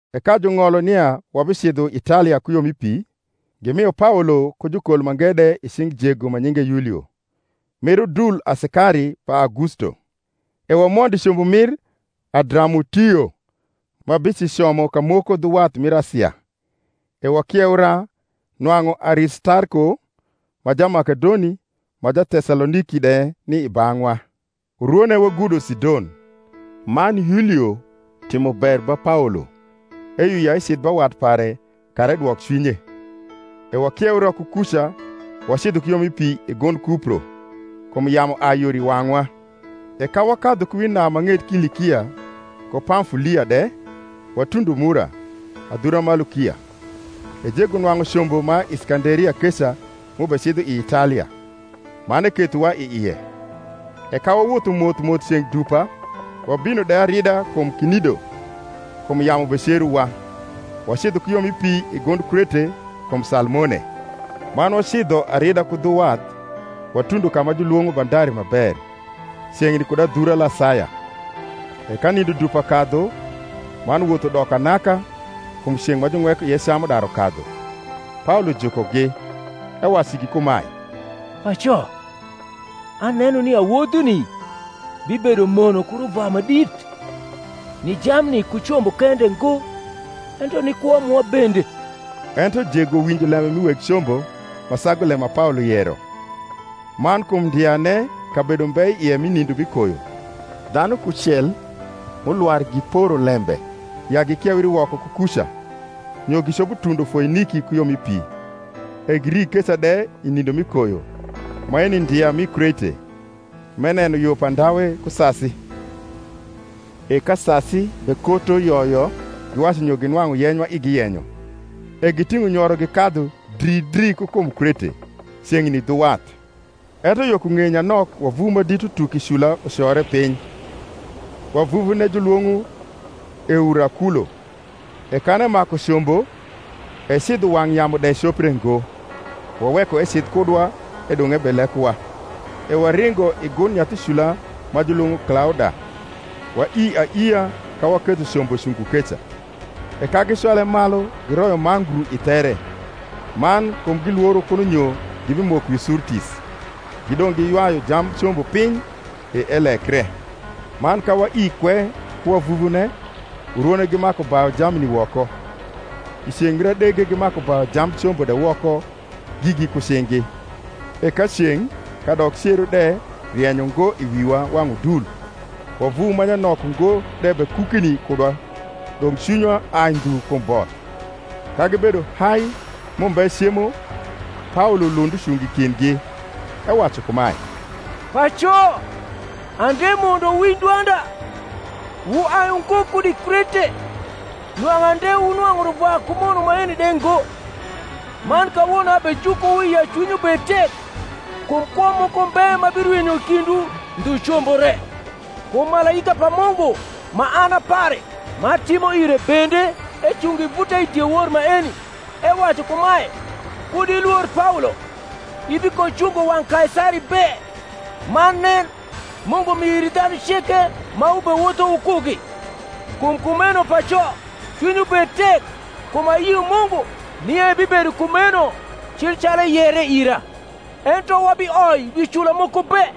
E ka jung’olo nia wabicidho Italia ku yo mi pi, gimio Paolo ku jukol mange de i cing’ jego ma nyinge Yulio, mir udul asikari pa Augusto. E wamondo i combo mir Adramutio, ma bicicomo kamoko dhu wath mir Asia, e wakieura, nwang’u Aristarko, ma Jamakedoni ma Tesaloniki de, ni i bang’wa. Urwone wagudo Sidon: man Yulio timo ber ba Paolo, eyio ya ecidh ba wat pare kara edwok cwinye. E wakieura ku kuca, wacidho ku yo mi pi i gund Kupro, kum yamu ai yor i wang’wa. E ka wakadhu ku wi nam ma ng’et Kilikia ku Pamfulia de, watundo Mura, adhura ma Lukia. E jego nwang’u combo ma Iskanderia keca m’ubecidho i Italia; man ekethowa i ie. E ka wawotho moth moth ceng’ dupa, wabino de arida kum Knido, kum yamu becerowa, wacidho ku yo mi pi i gund Krete, kum Salmone; man wacidho arida ku dhu wath watundo ka ma julwong’o Bandari ma ber; ceng’ni kud adhura Lasaya. E ka nindo dupa kadhu, man woth udoko anaka, kum ceng’ ma juweko ie cam udaru kadhu, Paolo jukogi, ewacu igi kumae, Paco, aneno nia wodhuni bibedo mono ku ruvwa ma dit, ni jamni ku combo kende ngo, ento ni kwo mwa bende. Ento jego winjo lembe mi weg combo, ma sagu lembe ma Paolo yero. Man kum ndiane kabedo mbe i ie mi nindo mi koyo, dhanu kucel m’ulwar giporo lembe ya gikieuri woko ku kuca, nyo gicopo tundo Foiniki ku yo moko, e giri keca de i nindo mi koyo; maeui ndia mi Krete, m’eneno yo pa ndawe ku sasi. E ka sasi bekoto yo yo, giwacu nyo ginwang’u yeny ma igi yenyo, e giting’o nyoro gikadhu dri dri ku kum Krete, ceng’ni dhu wath. Ento yo ku ng’eye nyanok wavuvu ma dit utuk i cnia ucore piny, wavuvune julwong’o Eurakulo: e kan emaku combo, e cidho wang’ yamu de copre ngo, waweko ecidh kudwa, edong’ ebelekowa. E waringo i gund nyathi cula ma julwong’o Klauda, waii aiia ka waketho combo cungo keca: e ka gicwale maiu, giroyo mangru i there; man, kum gilworo kuno nyo gibimoko wi Surtis, gidong’ giywayu jamb combo piny, e elekre. Man kawaii kwe ku wavuvune, urwone gimaku bayu jamni woko; i ceng’ mir adege gimaku bayu jamb combo de woko gigi ku cing’gi. E ka ceng’ kadok cero de rieny ungo i wiwa wang’ udul, wavuvu ma nyanok ungo de bekukni kudwa, dong’ cwinywa ai ndhu kum both. Ka gibedo hai m’umbe cemo, Paolo lund ucungo i kindgi, ewacu kumae, Paco, ande mundo wuwinj dwanda, wuai ungo kud i Krete, nwang’u ande wunwang’u ruvwa ku mono maeni de ngo. Man kawono abejukowu ya cwinywu bed tek; kum kwo moko mbe ma birwinyo i kindwu, ndhu combo re. Kum malaika pa Mungu ma an a pare, m’atimo ire bende, ecungo i vuta i diewor maeni, ewacu kumae, Kud ilwor, Paolo; ibikocungo wang’ Kaisari be: man nen, Mungu mio iri dhanu ceke ma wubewotho wukugi. Kum kumeno, paco, cwinywu bed tek: kum ayio Mungu, nia ebibedo kumeno cil calu eyere ira. Ento wabioi wi cula moko be.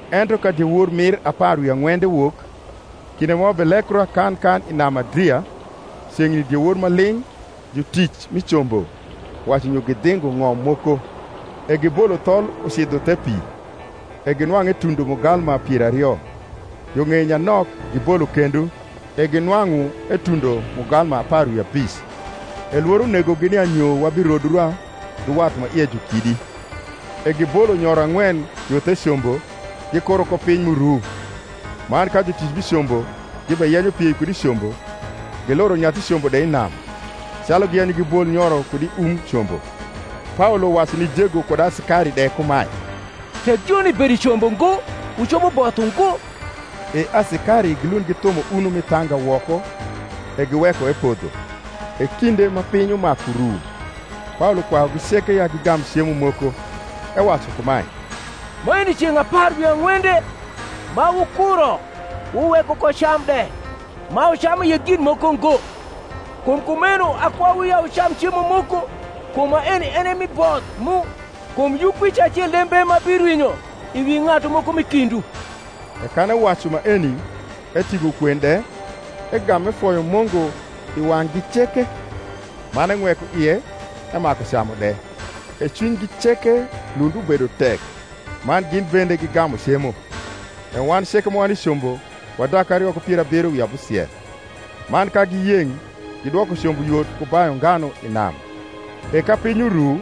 Ento ka diewor mir apar wi ang’wende wok, kinde ma wabelekra kan kan i nam Adria, ceng’ni diewor ma ling’ jutic mi combo wacu nyo gidhingo ng’om moko: e gibolo thol ucidho the pi, e ginwang’u etundo mugalma pier ario, yo ng’eye nyanok, gibolo kendo, e ginwang’u etundo mugalma apar wi abic, E lworo negogi nia nyo wabirodra dhu wath ma ie ju kidi, e gibolo nyoro ang’wen yo the combo, gikuro ko piny m’uru. Man ka jutic mi combo gibeyenyo piei kud i combo, giluro nyathi combo de i nam, calu giyenyo gibol nyoro kud i um combo, Paolo wacu ni jego kud asikari de kumae, Tek joni bedo i combo ngo wucopo both ungo. E asikari gilund githumo uno mi thanga woko, e giweko epodho. E kinde ma piny umaku ru, Paolo kwayugi ceke ya gigam cemo moko, ewacu kumae, Maeni ceng’ apar wi ang’wende ma wukuro wuweko ko cam de, ma wucamu ie gin moko ngo. Kum kumeno akwayuwu ya wucam cemo moko: kum maeni en e mi both mu: kum yukwic acel de mbe ma birwinyo i wi ng’atu moko m’i kindwu. E kan ewacu maeni, eting’o kwen de, egam efoyo Mungu i wang’gi ceke; man eng’weko ie, emaku camu de. E cwinygi ceke lund ubedo tek, man gin bende gigamu cemo. E wan ceke ma wani i combo wa dak ario ku pier abiro wi abusiel. Man ka giyeng’, gidwoko combo yot ku bayu nganu i nam. E ka piny uru,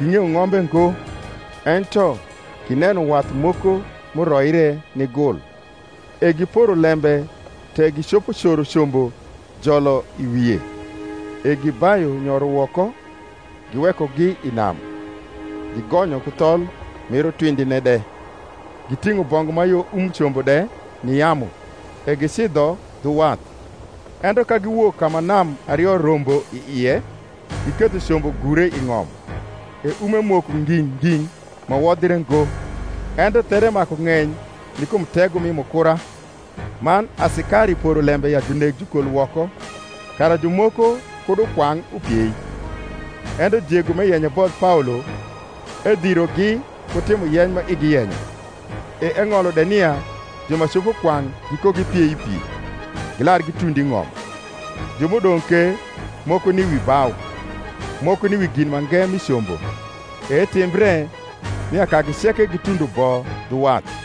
gmg’eyo ng’ombe ngo: ento gineno wath moko m’uroire ni gul, e giporo lembe tek gicopo coro combo jolo i wie. E gibayu nyoro woko, giwekogi i nam, gigonyo ku thol mir utwindine de; giting’o bongu ma yo um combo de ni yamu, e gicidho dhu wath. Ento ka giwok ka ma nam ario rombo i ie, giketho combo gure i ng’om; e ume moko nging’ nging’ ma wodhre ngo, ento there maku ng’eny ni kum tego mi mukura. Man asikari poro lembe ya juneg jukol woko, kara jumoko kud ukwang’, upiei. Ento jego m’eyenyo ebodh Paolo, edhirogi ku timo yeny ma igi yenyo; e eng’olo de nia ju ma copo kwang’ gikogipiei i pi, gilar gitund i ng’om; ju m’udong’ ke, moko ni wi bau, moko ni wi gin mange mi combo. E etimbre, nia kagi ceke gitundo bo dhu wath.